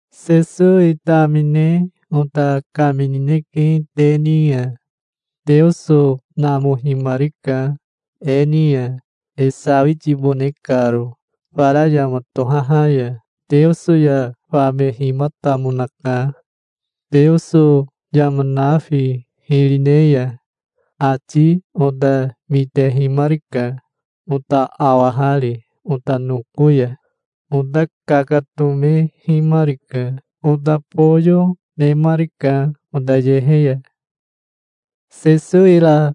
Sesowi tamine ota kaminineke te ni ya. Teoso namohimarika e ni ya, e sawitibone karo fara yama tohaha ya. Teoso ya famehimatamonaka, Teoso yama nafi hiri ne ya. Ati ota mitehimarika, ota awahari ota noko ya. Ota kakatomehimarika. Ota boyo, nemarika ota yehe ya. Sesowi ra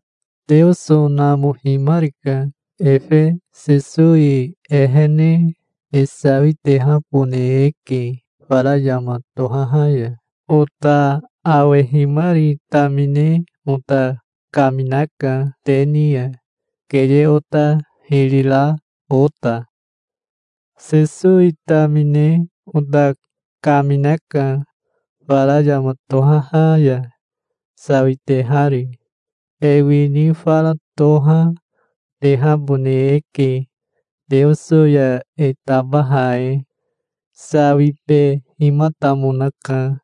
Teoso namohimarika. Efe Sesowi ehene e sawitehabone eke fara yama tohaha ya. Ota awehimari tamine ota kaminaka te ni ya, keye ota hiri ra ota. Sesowi tamine ota kaminaka, fara yama tohaha ya sawitehari. E wini fara toha, tehabone eke Teoso ya e tabaha e. Sawibehimatamonaka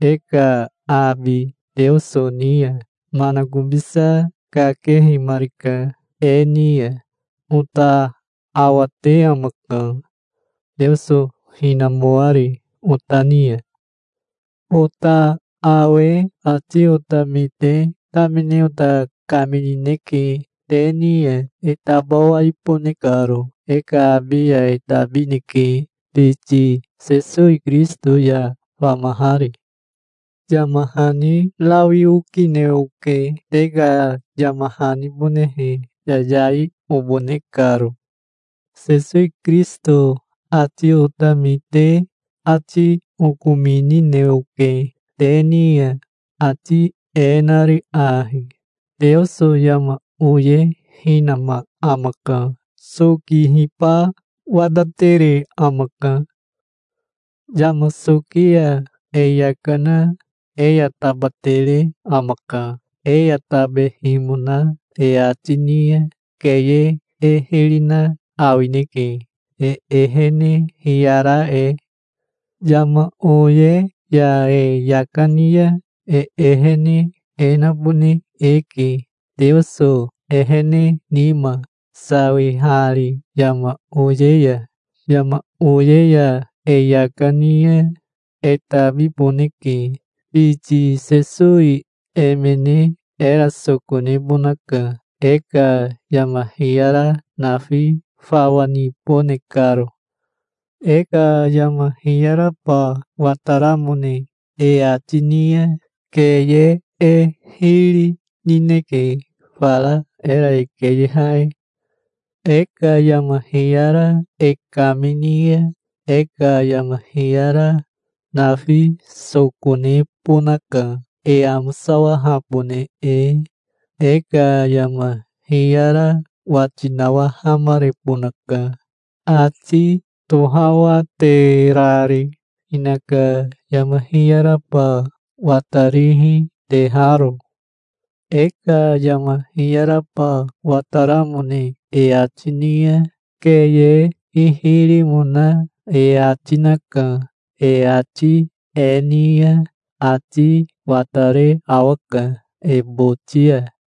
e ka abi Teoso ni ya. Manakobisa kakehimarika e ni ya. Ota awate amaka, Teoso hinamoari ota ni ya. Ota awe ati ota mite tamine ota kaminineke te ni ya, e tabawaibone karo. E ka abi ya e tabineke, biti Sesowi Kirisito ya famahari. Yama hani rawi okine oke, te ka yama hanibonehe, yayai obone karo. Sesowi Kirisito ati ota mite ati okominine oke te ni ya, ati e nari ahi: Teoso yama oye hinama amaka. Sokihiba watatere amaka. Yama soki ya e yaka na e ya tabatere amaka. E ya tabehimona e ati ni ya keye e hiri na awineke, e ehene hiyara e. Yama oye ya e yaka ni ya e ehene e nabone eke Teoso ehene nima, sawihari yama oye ya. Yama oye ya e yaka ni ya e tabiboneke. Biti Sesowi emene era soko nebonaka, e ka yama hiyara nafi fawa nibone karo. E ka yama hiyaraba wataramone e ati ni ya keye e hiri nineke, fara era e keyeha e. E ka yama hiyara e kamini ya e ka yama hiyara nafi soko nebonaka, e amosawahabone e. E ka yama hiyara wati nawahamarebonaka, ati tohawaterari, hinaka yama hiyaraba watarihi teharo. E ka yama hiyaraba wataramone e ati ni ya, keye hihirimona e ati naka. E ati e ni ya ati watare awaka e boti ya.